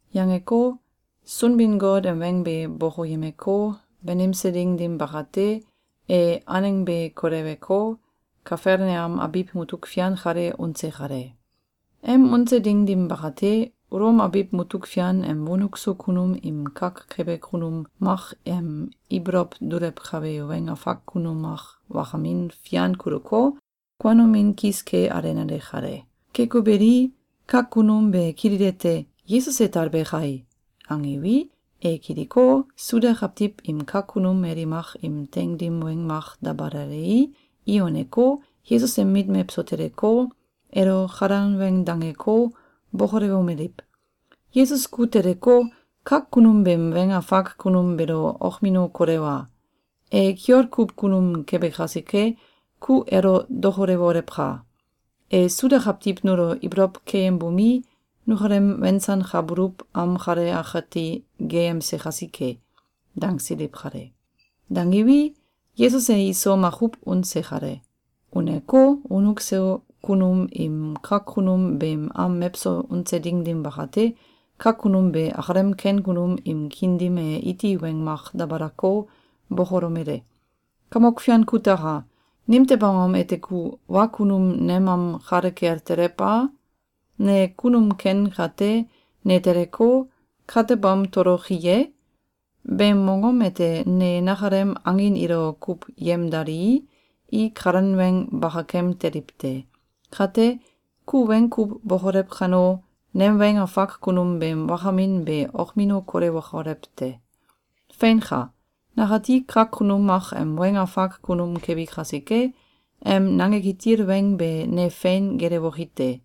Yangeko, Sunbin-Got em weng be bokoyemeko, banimse ding dim bakate, e aneng be koleweko, Kafelneam abiw mutuk fian kalo unse kale. Em unse ding dim bakate, Ulom abiw mutuk fian em wonuk so kunum im kak kebe kunum mak em ibolow dulewkabe weng afak kunum mak wakamin fian kuluko, kuanomin kis ke alenale kale. Keko beli, kak kunum be kililete: “Yesus e talbe kai!”, angiwi, e kiliko, Suda kawtiw im kak kunum mali mak im teing dim weng mak dabalalei, i uneko, Yesus em mit mewso teleko, elo kalan weng dangeko, bokolewomeliw: “Yesus ku teleko, kak kunum beem weng afak kunum beelo okmino kolewa! E kiol kuw kunum kebe kasike, ku elo dokolewolewka! E Suda kawtiw nulo ibolow keyembomi, nukalem wensankabuluw am kale akati geyemse kasike.”, dangsiliw kale. Dangiwi, Yesus e iso makuw unse kale. Uneko, wonuk so kunum im kak kunum beem am mewso unse ding dim bakate, kak kunum be akalem ken kunum im kiin dim e iti weng mak dabalako, bokolomele: “Kamok fian kutaka! Nimtew angom ete ku wa kunum nem am kale kel telew a? Ne kunum ken kate, ne teleko, katebam toloki ye? Beem mongom ete ne nakalem angin ilo kuw yemdalii, i kalan weng bakakem teliw te. Kate, ku weng kuw bokolew kano, nem weng afak kunum beem wakamin be okmino kolewokolew te. Feinka! Nakati kak kunum mak em weng afak kunum kebi kasike, em nange kitil weng be ne fein gelewoki te.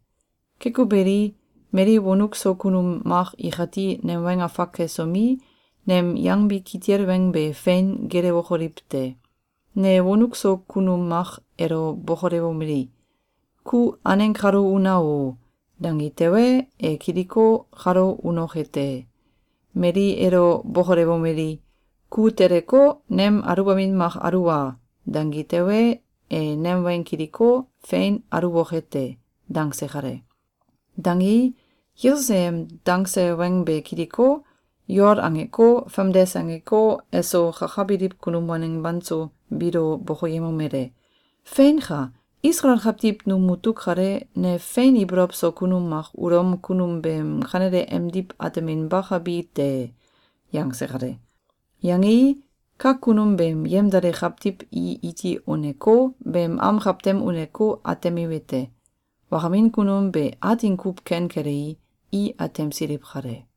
Keko beli, mali wonuk so kunum mak ikati nem weng afak kesomi, nem yangbi kitil weng be fein gelewokoliw te. Ne wonuk so kunum mak elo bokolewomeli: ‘Ku aneng kalo una o!’, dangi tewe, e kiliko, kalo unoke te. Mali elo bokolewomeli: ‘Ku teleko, nem aluwbamin mak aluwa!’, dangi tewe, e nem weng kiliko, fein aluwoke te.”, dangse kale. Dangei, Yesus e em dangse weng be kiliko, yol angeko, famdes angeko, eso kakabiliw kunum waneng banso biilo bokoyemomele: “Feinka! Isalael kawtiw num mutuk kale, ne fein ibolow so kunum mak Ulom kunum beem kanele emdiw ateminbakabi te.”, yangse kale. Yangei, kak kunum beem yemdale kawtiw i iti uneko, beem am kawtem uneko, atemiwete: Wakamin kunum be atin kuw ken kelei, i atemsiliw kale.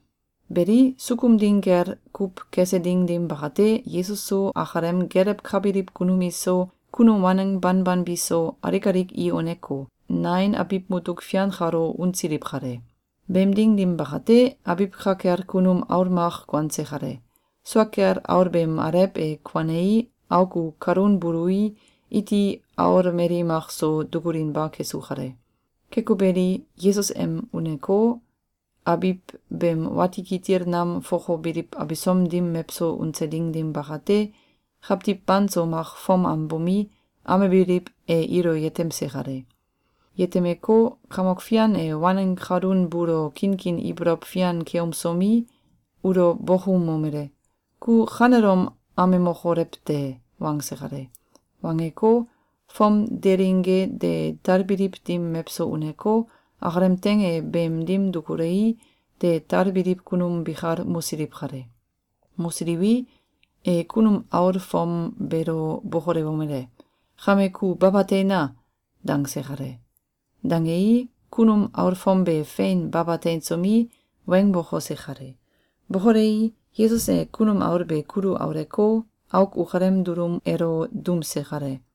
Beli, sukum ding gel kuw kese ding dim bakate, Yesus so, akalem gelewkabiliw kunum iso, kunum waneng banban biso, alik alik i uneko, Nain abiw mutuk fian kalo unsiliw kale. Beem ding dim bakate, abiw ka kel kunum aul mak kuanse kale. Sua kel aul beem alew e kuanei, auk u kalun bului, iti aul mali mak so dukulinba kesu kale. Keko beli, Yesus em uneko, abiw beem wati kitil nam fokobiliw abisom dim mewso unse ding dim bakate, kawtiw banso mak fom am bomi, amebiliw, e ilo yetemse kale. Yetemeko, Kamok Fian e waneng kalun buulo kinkin ibolow fian keumsomi, ulo bokoumomele: “Ku kanelom amemokolew te!”, wangse kale. Wangeko, fom delingge de talbiliw dim mewso uneko, akalem teing e beem dim dukulei, de talbiliw kunum bikal mosiliw kale. Mosiliwi, e kunum aul fom beelo bokolewomele: “Kame ku baba teina!”, dangse kale. Dangei, kunum aul fom be fein baba teinsomi, weng bokose kale. Bokolei, Yesus e kunum aul be kulu auleko, auk ukalem dulum elo duumse kale.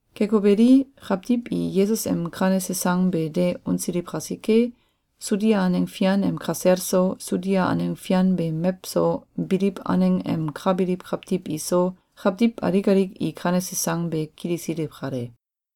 Keko beli, kawtiw i Yesus em kanese sang be de unsiliw kasike, Sudia aneng fian em kasel so, Sudia aneng fian beem mewso biliw aneng em ka biliw kawtiw iso, kawtiw alik alik i kanese sang be kilisiliw kale.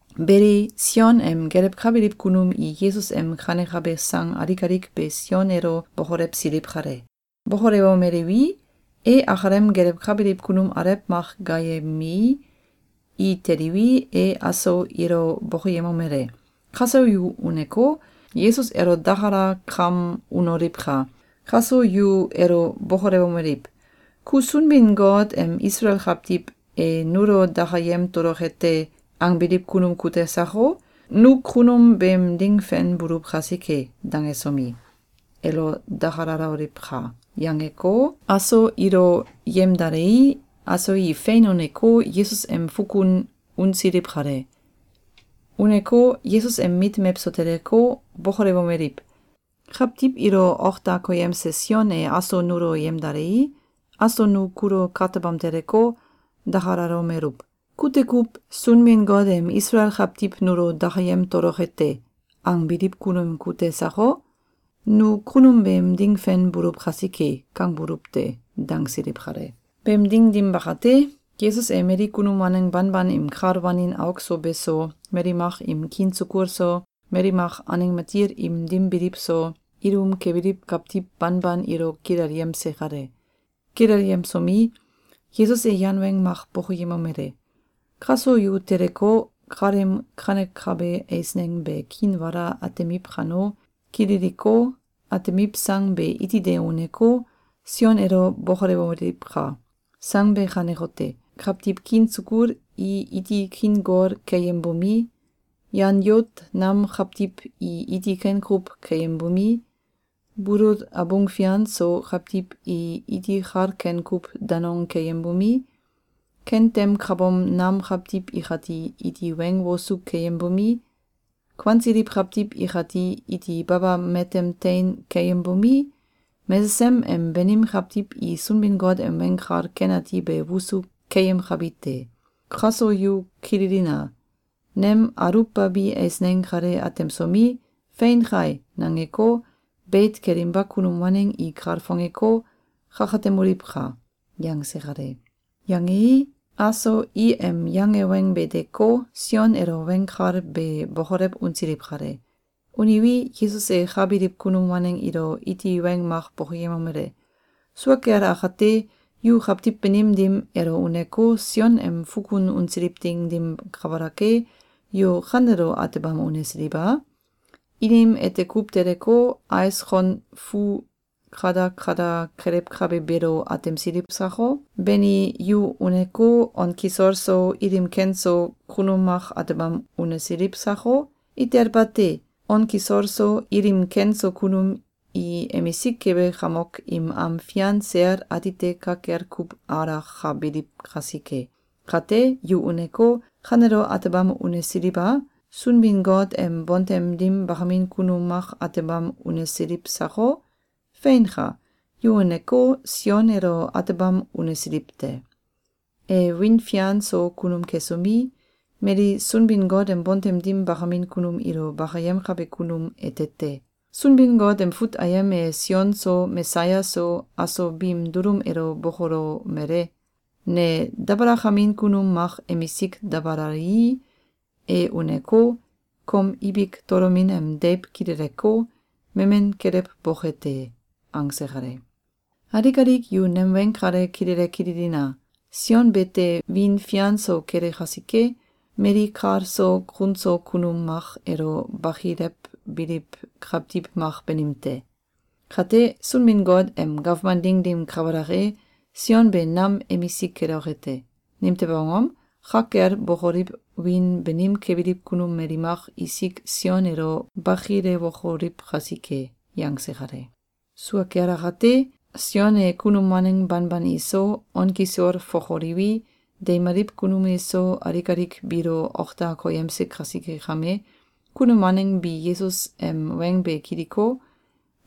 Beli, Sion em gelewkabiliw kunum i Yesus em kanekabe sang alik alik be Sion elo bokolewsiliw kale. Bokolewomeliwi, e akalem gelewkabiliw kunum alew mak gaayemei, i teliwi, e aso ilo bokoyemomele: “Kaso yu uneko, Yesus elo dakalakam unoliwka! Kaso yu elo bokolewomeliw: ‘Ku Sunbin-Got em Isalael kawtiw ‘E nulo dakayem toloke te!’, angbiliw kunum kute sako? Nu kunum beem ding fen buluw kasike.’, dangesomi, elo dakalaloliwka!”, yangeko, aso ilo yemdalei, aso i fein uneko, Yesus em fukun unsiliw kale. Uneko, Yesus em mit mewso teleko, bokolewomeliw: “Kawtiw ilo ok da koyemse Sion e aso nulo yemdalei, aso nu kulo katebam teleko, dakalalomeluw: ‘Kute kuw ‘Sunbin-Got em Isalael kawtiw nulo dakayem toloke te!’, angbiliw kunum kute sako? Nu kunum beem ding fen buluw kasike.’, kangbuluw te.”, dangsiliw kale. Beem ding dim bakate, Yesus e mali kunum waneng banban im kal wanin auk so beso, mali mak im kiin sukul so, mali mak aneng matil im dim biliw so, ilum kebiliw kawtiw banban ilo kilelyemse kale. Kilelyemsomi, Yesus e yan weng mak bokoyemomele: “Kaso yu teleko, kaleem kanekabe eisneng be kiinwala atemiw kano, kililiko, atemiw sang be iti de uneko, Sion elo bokolewoliwka! Sang be kanekote: Kawtiw kiin sukul i iti kiin gol keyembomi, yan yout nam kawtiw i iti ken kuw keyembomi, bulul abung fian so kawtiw i iti kal ken kuw danong keyembomi, kentem kabom nam kawtiw ikati iti weng wosu keyembomi, kuansiliw kawtiw ikati iti baba matem tein keyembomi, mesesem em banim kawtiw i Sunbin-Got em Weng Kal Ken Ati be wosu keyemkabi te. Kaso yu Kililina! Nem aluwbabi eisneng kale atemsomi, ‘Fein kai!’, nangeko, beit kelinba kunum waneng i kalfongeko, kakatemoliwka!”, yangse kale. Yangei, aso i em yange weng be deko, Sion elo weng kal be bokolew unsiliw kale. Uniwi, Yesus e ka biliw kunum waneng ilo iti weng mak bokoyemomele: “Sua kel akate, yu kawtiw banim dim elo uneko, Sion em fukun unsiliw ding dim kabalak e, yu kanelo atebam unesiliw a? Inim ete kuw teleko, ais kon fuu kadakada kelewkabe beelo atemsiliw sako? Bani, yu uneko, on kisol so, ilim ken so, kunum mak atebam unesiliw sako? Itel bate! On kisol so, ilim ken so kunum i emisik kebe kamok im am fian sel atite ka kel kuw alakabiliw kasike. Kate, yu uneko, kanelo atebam unesiliw a? Sunbin-Got em bontem dim bakamin kunum mak atebam unesiliw sako? Feinka! Yu uneko, Sion elo atebam unesiliw te. E wiin fian so kunum kesomi, mali Sunbin-Got em bontem dim bakamin kunum ilo bakiyemkabe kunum ete te. Sunbin-Got em fut ayem e Sion so Mesaya so, aso biim dulum elo bokolomele: ‘Ne dabalakamin kunum mak emisik dabalalii, e uneko, kom ibik tolomin em deiw kileleko, memen kelewboke te.’, angse kale. Alik alik yu nem weng kale kilele kililina! Sion bete wiin fian so kele kasike, mali kal so kun so kunum mak elo bakilewbiliw kawtiw mak banim te. Kate, Sunbin-Got em gawman ding dim kabalak e, Sion be nam emisik keloke te. Nimtew angom? Ka kel bokoliw wiin banim kebiliw kunum mali mak isik Sion elo bakilewokoliw kasike.”, yangse kale. Sua kel akate Sion e kunum waneng banban iso, on kisol fokoliwi, deimaliw kunum iso, alik alik biilo ok da koyemse kasike kame, Kunum waneng bi Yesus em weng be kiliko,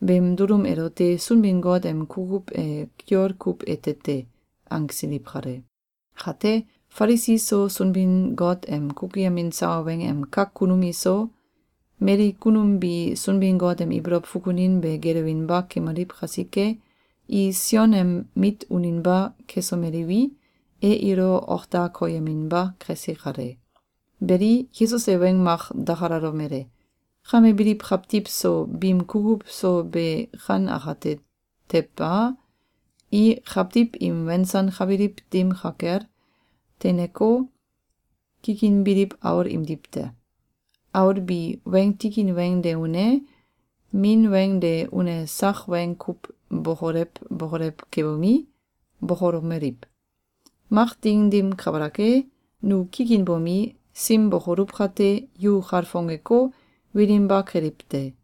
beem dulum elote “Sunbin-Got em kukuw e kiol kuw ete te!”, angsiliw kale. Kate, Falisi so, Sunbin-Got em kukuyemin sawa weng em kak kunum iso, mali kunum bi Sunbin-Got em ibolow fukunin be gelewinba kemaliw kasike, i Sion em mit uninba kesomeliwi, e ilo ok da koyeminba kese kale. Beli, Yesus e weng mak dakalalomele: “Kame biliw kawtiw so biim kukuw so be kan akate tew a? I kawtiw im wensankabiliw dim ka kel, teineko, kikinbiliw aul imdiw te. Aul bi weng tikin weng de une, min weng de une sak weng kuw bokolew bokolew kebomi, bokolomeliw: ‘Mak ding dim kabalak e, nu kikinbomi, sim bokoluw kate, yu kalfongeko, wilinba keliw te!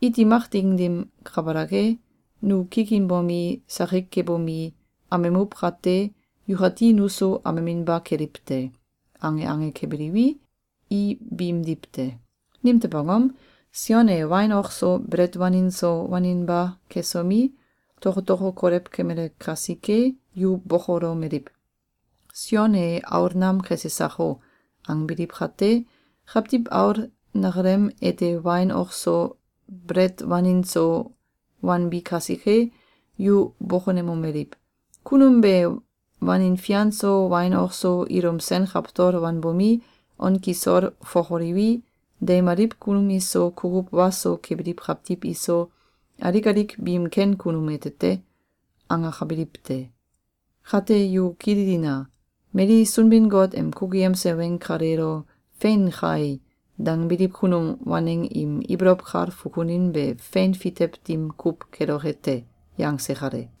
Iti mak ding dim kabalak e, nu kikinbomi, sakik kebomi, amemuw kate, yukati nuso ameminba keliw te.’, ange ange kebiliwi, i biimdiw te. Nimtew angom? Sion e wain ok so, belet wanin so, waninba kesomi, tokotoko kolew kemele kasike, yu bokolomeliw: ‘Sion e aol nam kese sako!’, angbiliw kate, Kawtiw Aul neakalem ete wain ok so, belet wanin so, wanbi kasike, yu bokonemomeliw: ‘Kunum be wanin fian so, wain ok so, ilum sen kawtol wanbomi, on kisol fokoliwi, deimaliw kunum iso, kukuw wa so kebiliw kawtiw iso, alik alik biim ken kunum ete te!’, angakabiliw te. Kate, yu kililina! Mali Sunbin-Got em kukuyemse weng kaleelo ‘Fein kai!’, dangbiliw kunum waneng im ibolow kal fukunin be fein fitew dim kuw keloke te.”, yangse kale.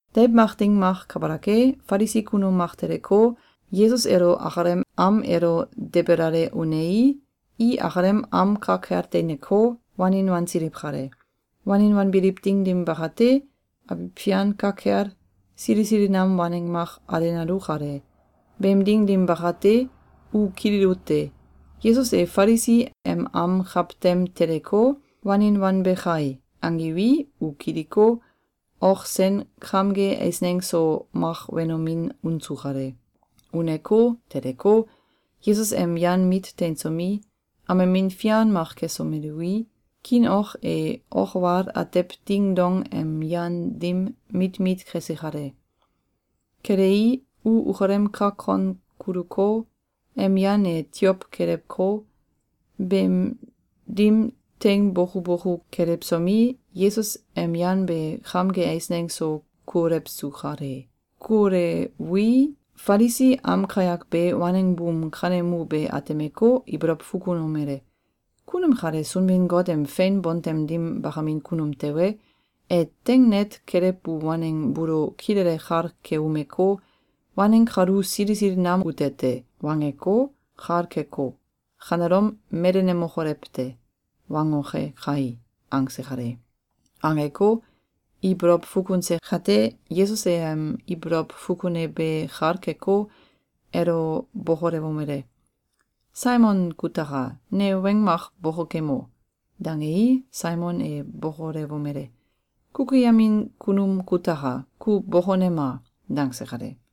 Deiw mak ding mak kabalak e, Falisi kunum mak teleko, Yesus elo akalem am elo debelale unei, i akalem am ka kel teineko, wanin wansiliw kale. Wanin wanbiliw ding dim bakate, abiw fian ka kel, sili sili nam waneng mak alenalu kale. Beem ding dim bakate, u kililute: “Yesus e Falisi em am kawtem teleko, wanin wanbe kai!”, angiwi, u kiliko, ok sen kamge eisneng so mak wenomin unsu kale. Uneko, teleko, Yesus em yan mit teinsomi, amemin fian mak kesomelui, kiin ok e ok wal atew ding dong em yan dim mit mit kese kale. Kelei, u ukalem kak kon kuluko, em yan e tiow kelewko, beem dim teing boku boku kelewsomi, Yesus em yan be kamge eisneng so kuolewsu kale. Kuolewui, Falisi am kayak be, waneng buum kanemu be atemeko, ibolow fukunomele: “Kunum kale Sunbin-Got em fein bontem dim bakamin kunum tewe, e teing net kelewbu waneng buulo kilele kal keumeko, ‘Waneng kalu sili sili nam ute te!’, wangeko, kal keko, ‘Kanelom melenemokolew te!’, wangoke kai!”, angse kale. Angeko, ibolow fukunse kate, Yesus e em ibolow fukune be kal keko, elo bokolewomele: “Saimon kutaka! Ne weng mak bokokemo!”, dangei, Saimon e bokolewomele: “Kukuyemin kunum kutaka! Ku bokonema!”, dangse kale.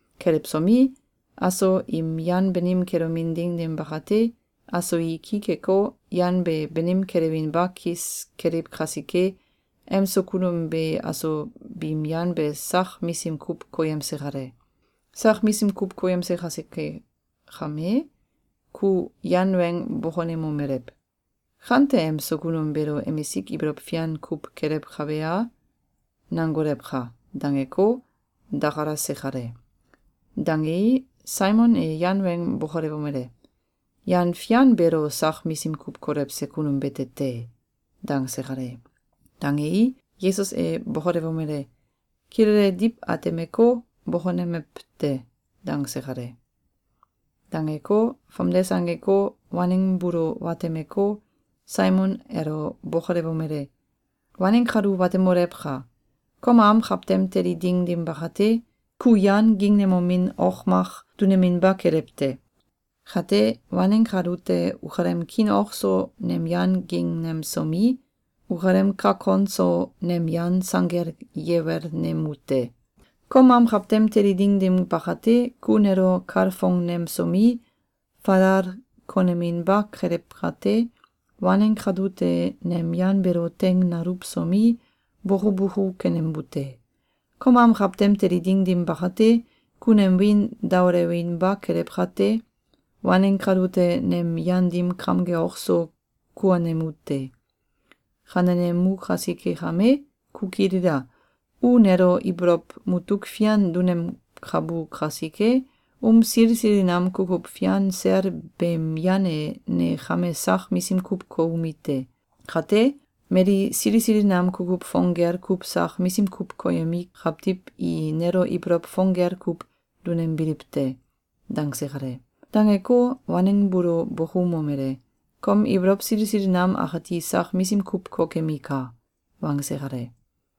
Kelewsomi, aso im yan banim kelomin ding dim bakate, aso i ki keko, yan be banim kelewinba kis keliw kasike, em so kunum be aso biim yan be sak misim kuw koyemse kale. Sak misim kuw koyemse kasike kame, ku yan weng bokonemomelew: ‘Kante emso kunum beelo emisik ibolow fian kuw kelewkabe a?’, nangolewka!”, dangeko, dakalase kale. Dangei, Saimon e yan weng bokolewomele: “Yan fian beelo sak misim kuw kolewse kunum bete te!”, dangse kale. Dangei, Yesus e bokolewomele: “Kilele diw atemeko, bokonemew te.”, dangse kale. Dangeko, famdes angeko, waneng buulo watemeko, Saimon elo bokolewomele: “Waneng kalu watemolewka! Kom am kawtem teli ding dim bakate, ku yan gingnemomin ok mak duneminba kelew te. Kate, waneng kalute ukalem kiin ok so nem yan gingnemsomi, ukalem kak kon so nem yan sanggel yewelnemu te. Kom am kawtem teli ding dim bakate, ku nelo kalfongnemsomi, falal koneminba kelew kate, waneng kalute nem yan beelo teing naluwsomi, boku boku kenembu te. Kom am kawtem teli ding dim bakate, ku nem wiin daolewinba kelew kate, waneng kalute nem yan dim kamge ok so kuonemu te. Kanenemu kasike kame, ku kilila! U nelo ibolow mutuk fian dunemkabu kasike, um sili sili nam kukuw fian sel beem yan e ne kame sak misim kuw koumi te. Kate, mali sili sili nam kukuw fong gel kuw sak misim kuw koyemi kawtiw i nelo ibolow fong gel kuw dunembiliw te.”, dangse kale. Dangeko, waneng buulo bokoumomele: “Kom ibolow sili sili nam akati sak misim kuw kokemika!”, wangse kale.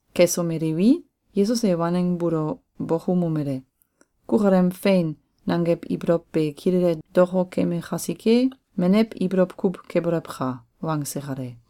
Kesomeliwi, Yesus e waneng buulo bokoumomele: “Kukalem ‘Fein!’, nangew ibolow be kilele dokokeme kasike, menew ibolow kuw kebolewka!”, wangse kale.